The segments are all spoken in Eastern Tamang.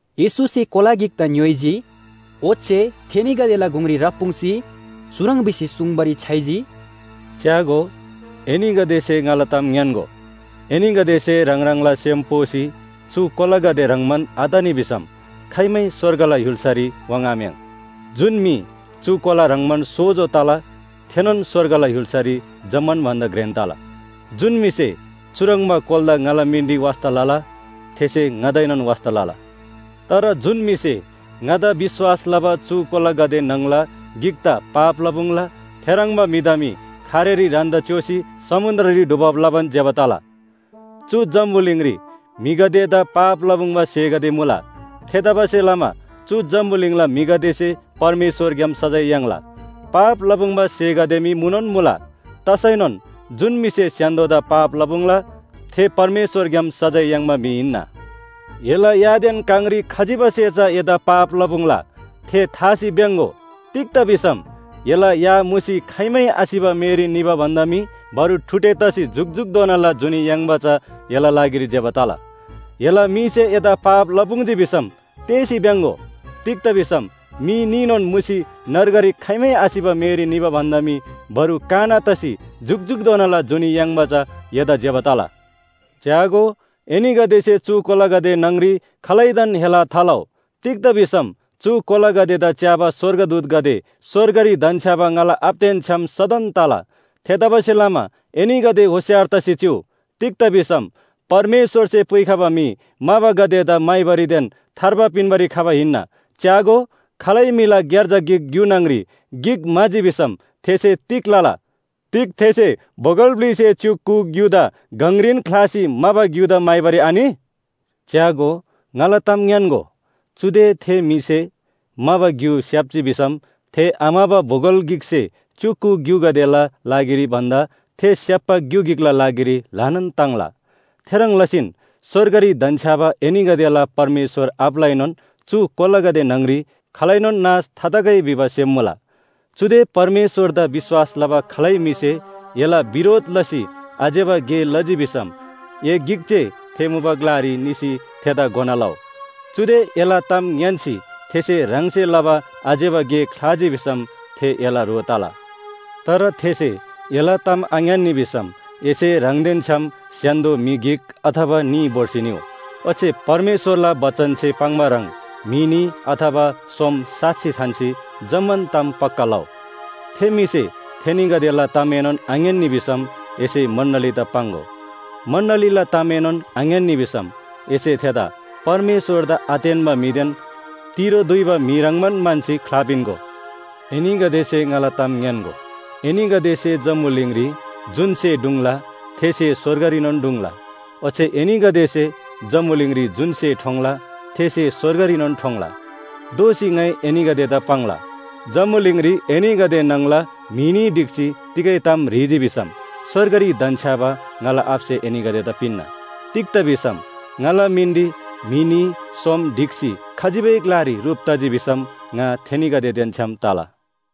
येशूसे कोला गिकदा ङ्‌योइजी। ओच्‍छे थेनीगदेला गुङरी राप्‍पुङ्‍सी, चुह्रङ् भिसी सुङ्बारी छ्‌याइजी, “च्‍यागो, एनीगदेसे ङाला ताम ङ्‌यान्‍गो, एनीगदेसे ह्राङ ह्राङला सेम पोसी चु कोलागदे ह्रङ्‌बा आतनी भिसम खाइमै स्‍वर्गला य्‍हुल्‍सारी वाङ्‌आम्‍याङ्। जुन म्‍हि चु कोला ह्रङ्‌बान सोजो तला थेनोन स्‍वर्गला य्‍हुल्‍सारी जम्‍मान भन्‍दा घ्रेन तला। जुन म्‍हिसे चुह्रङ्बा कोलादा ङाला मिनरी वास्‍ता लला, थेसे ङादाएनोन वास्‍ता लला। “तर जुन म्‍हिसे ङादा विश्‍वास लबा चु कोलागदे न्‍हङला गिकदा पाप लपुङ्ला, थेह्रङ्बा म्‍हिदा मी खारेरी ह्रान्‍दा च्‍योसी समुन्‍द्ररी डुबब लबान ज्‍यबा तला। चु जम्‍बुलिङरी म्‍हिगदेदा पाप लपुङ्बा स्‍हेगदे मुला। थेतबासेलमा चु जम्‍बुलिङला म्‍हिगदेसे परमेश्‍वरग्‍याम सजाय याङ्ला। पाप लपुङ्बा स्‍हेगदे मी मुनोन मुला, तसैनोन जुन म्‍हिसे स्‍य्‍हान्‍दोदा पाप लपुङ्ला थे परमेश्‍वरग्‍याम सजाय याङ्बा म्‍हि हिन्‍ना। “एला यादेन काङरी खजिबासे चा एदा पाप लपुङ्ला थे थासी भ्‍याङ्‍गो। तिग्‍दा भिसम या काङ मुसी खाइमै आसिबा मेरी निबा भन्‍दा मी बरु ठुडे तसी जुकजुकधोनाला जुनी याङ्बा चा एला लागिरी ज्‍यबा तला। एला मीसे एदा पाप लपुङ्जी भिसम तेःसी भ्‍याङ्‍गो। तिग्‍दा भिसम मी न्‍हीनोन मुसी नर्गरी खाइमै आसिबा मेरी निबा भन्‍दा मी बरु काना तसी जुकजुकधोनाला जुनी याङ्बा चा एदा ज्‍यबा तला। “च्‍यागो, एनीगदेसे चु कोलागदे न्‍हङ‍री खालैदान हेला थालउ। तिग्‍दा भिसम चु कोलागदेदा च्‍याबा स्‍वर्गदूतगदे स्‍वर्गरी धन्‍छ्‌याबा ङाला आबादेन छ्‌याम सदन तला। थेतबासेलमा एनीगदे होशियार तसी चिउ। तिग्‍दा भिसम परमेश्‍वरसे पुइखबा म्‍हि म्‍हाबागदेदा म्‍हाइबारीदेन थार्बा पिन्‍बारी खबा हिन्‍ना। “च्‍यागो, खालै म्‍हिला ग्‍यार्जा गिक ग्‍यु न्‍हङ‍री गिक म्‍हाजी भिसम थेसे तिग लला? तिग थेसे बोगल ब्‍लिसे च्‍युक कु ग्‍युदा गङरीन ख्‍लासी म्‍हाबा ग्‍यु म्‍हाइबारी आनि? च्‍यागो, ङाला ताम ङ्‌यान्‍गो, चुदे थे म्‍हिसे म्‍हाबा ग्‍यु स्‍याप्‍जी भिसम थे आम्‍हबा बोगल ब्‍लिसे च्‍युक कु ग्‍युगदेला लागिरी भन्‍दा थे स्‍याप्‍बा ग्‍यु गिकला लागिरी ल्‍हानान ताङ्ला। थेह्रङ् लसीन स्‍वर्गरी धन्‍छ्‌याबा एनीगदेला परमेश्‍वर आबालाएनोन चु कोलागदे न्‍हङ‍री खालैनोन नाश थातगै भिबा सेम मुला। “चुदे परमेश्‍वरदा विश्‍वास लबा खालै म्‍हिसे एला बिरोध लसी आज्‍यबा गे लजी भिसम ए गिक जे थे मुबा ग्‍लारी निसी थेदा घोना लउ। चुदे एला ताम ङ्‌यान्‍सी थेसे ह्राङसे लबा आज्‍यबा गे ख्‍लाजी भिसम थे एला ह्रो तला। तर थेसे एला ताम आङ्‌यान्‍नी भिसम एसे ह्राङदेन छ्‌याम स्‍य्‍हान्‍दो म्‍हि गिक अथवा न्‍ही भोर्सी निउ। ओच्‍छे परमेश्‍वरला बचनसे पाङ्बा ह्रङ् म्‍हि न्‍ही अथवा सोम साक्षी थान्‍सी जम्‍मान ताम पक्‍का लउ। थे म्‍हिसे थेनीगदेला तामएनोन आङ्‌यान्‍नी भिसम एसे मण्‍डलीदा पाङ्‍गो। मण्‍डलीला तामएनोन आङ्‌यान्‍नी भिसम एसे थेदा परमेश्‍वरदा आतेन्‍बा म्‍हिदेन तिरो दुइबा म्‍हि ह्रङ्‌बान म्‍हन्‍सी ख्‍लापिन्‍गो। एनीगदेसे ङाला ताम ङ्‌यान्‍गो, एनीगदेसे जम्‍बुलिङरी जुन स्‍हे ढुङ्ला थे स्‍हे स्‍वर्गरीनोन ढुङ्ला। ओच्‍छे एनीगदेसे जम्‍बुलिङरी जुन स्‍हे ठोङ्ला, थे स्‍हे स्‍वर्गरीनोन ठोङ्ला। “दोःसी ङाइ एनीगदेदा पाङ्ला, जम्‍बुलिङरी एनीगदे न्‍हङला म्‍हि न्‍ही ढिक्‍सी तिगै ताम ह्रीजी भिसम स्‍वर्गरी धन्‍छ्‌याबा ङाला आबासे एनीगदेदा पिन्‍ना। तिग्‍दा भिसम ङाला मिनरी म्‍हि न्‍ही सोम ढिक्‍सी खजिबै ग्‍लारी ह्रुप तजी भिसम ङा थेनीगदेदेन छ्‌याम तला।”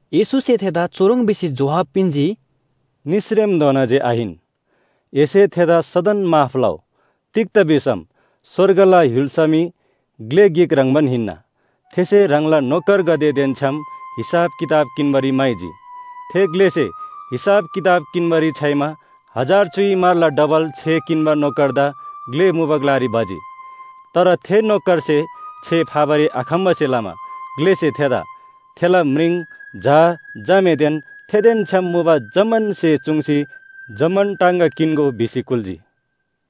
येशूसे थेदा चुह्रङ् भिसी जोहाब पिन्‍जी, “निसरेमधोना जे आहिन, एसे थेदा सदन माफ लउ! तिग्‍दा भिसम स्‍वर्गला य्‍हुल्‍सा मी ग्‍ले गिक ह्रङ्‌बान हिन्‍ना। थेसे ह्राङला नोकरगदेदेन छ्‌याम हिसाब किताब किन्‍बारी म्‍हाइजी। थे ग्‍लेसे हिसाब किताब किन्‍बारी छ्‌याइमा हजार च्‍युइ म्‍हरला डबल छे किन्‍बा नोकरदा ग्‍ले मुबा ग्‍लारी भजी। तर थे नोकरसे छे फाबारी आखम्‍बासे लमा ग्‍लेसे थेदा, थेला म्रिङ, झा झामेदेन थेदेन छ्‌याम मुबा जम्‍मान स्‍हे चूङ्सी जम्‍मान टाङगा किन्‍गो” भिसी कुल्‍जी।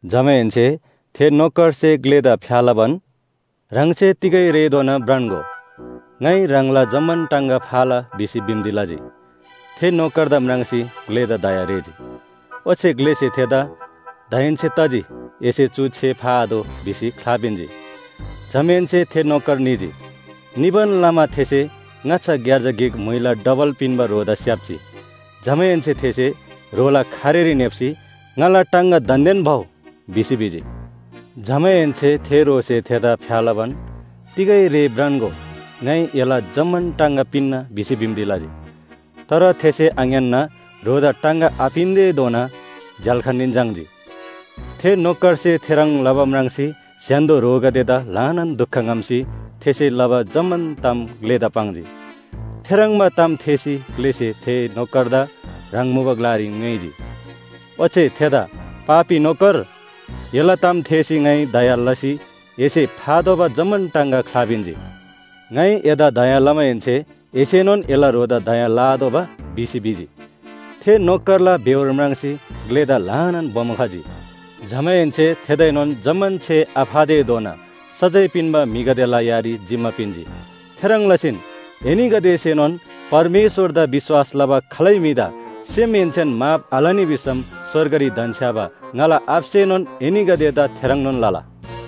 जमाहेन्‍से थे नोकरसे ग्‍लेदा फ्‍या लबान, “ह्राङसे तिगै रेधोना भ्रान्‍गो। ङाइ ह्राङला जम्‍मान टाङगा फाला” भिसी बिन्‍ती लजी। थे नोकरदा म्राङ्सी ग्‍लेदा दया रेःजी। ओच्‍छे ग्‍लेसे थेदा ‘दाहेन्‍से तजी, एसे चु छे फाआतोः’ भिसी ख्‍लापिन्‍जी। “जमाहेन्‍से थे नोकर निजी। निबान लमा थेसे ङाच्‍छा ग्‍यार्जा गिक म्‍हुइला डबल पिन्‍बा ह्रोदा स्‍याप्‍जी। जमाहेन्‍से थेसे ह्रोला खारेरी न्‍हेप्‍सी ‘ङाला टाङगा दान्‍देन भउ’ भिसी भिजी। जमाहेन्‍से थे ह्रोसे थेदा फ्‍या लबान, ‘तिगै रे भ्रान्‍गो ङाइ एला जम्‍मान टाङगा पिन्‍ना’ भिसी बिन्‍ती लजी। तर थेसे आङ्‌यान्‍ना ह्रोदा टाङगा आपिन्‍तेधोना झ्‍याल्‍खानरी झाङ्‌जी। “थे नोकरसे थेह्रङ् लबा म्राङ्सी स्‍य्‍हान्‍दो ह्रोगदेदा ल्‍हानान दुख ङ्‍हम्‍सी थेसे लबा जम्‍मान ताम ग्‍लेदा पाङ्जी। थेह्रङ्बा ताम थेःसी ग्‍लेसे थे नोकरदा ह्राङ मुबा ग्‍लारी ङ्‌योइजी। ओच्‍छे थेदा ‘पापी नोकर, एला ताम थेःसी ङाइ दया लसी एसे फातोःबा जम्‍मान टाङगा ख्‍लापिन्‍जी। ङाइ एदा दया लमाहेन्‍से एसेनोन एला ह्रोदा दया लआतोःबा?’ भिसी भिजी। थे नोकरला बेहोर म्राङ्सी ग्‍लेदा ल्‍हानान बोमो खजी। जमाहेन्‍से थेदाएनोन जम्‍मान छे आफातेधोना सजाय पिन्‍बा म्‍हिगदेला यारी जिम्‍मा पिन्‍जी। “थेह्रङ् लसीन एनीगदेसेनोन परमेश्‍वरदा विश्‍वास लबा खालै म्‍हिदा सेमहेन्‍सेन माफ आलनी भिसम स्‍वर्गरी धन्‍छ्‌याबा ङाला आबासेनोन एनीगदेदा थेह्रङ्नोन लला।”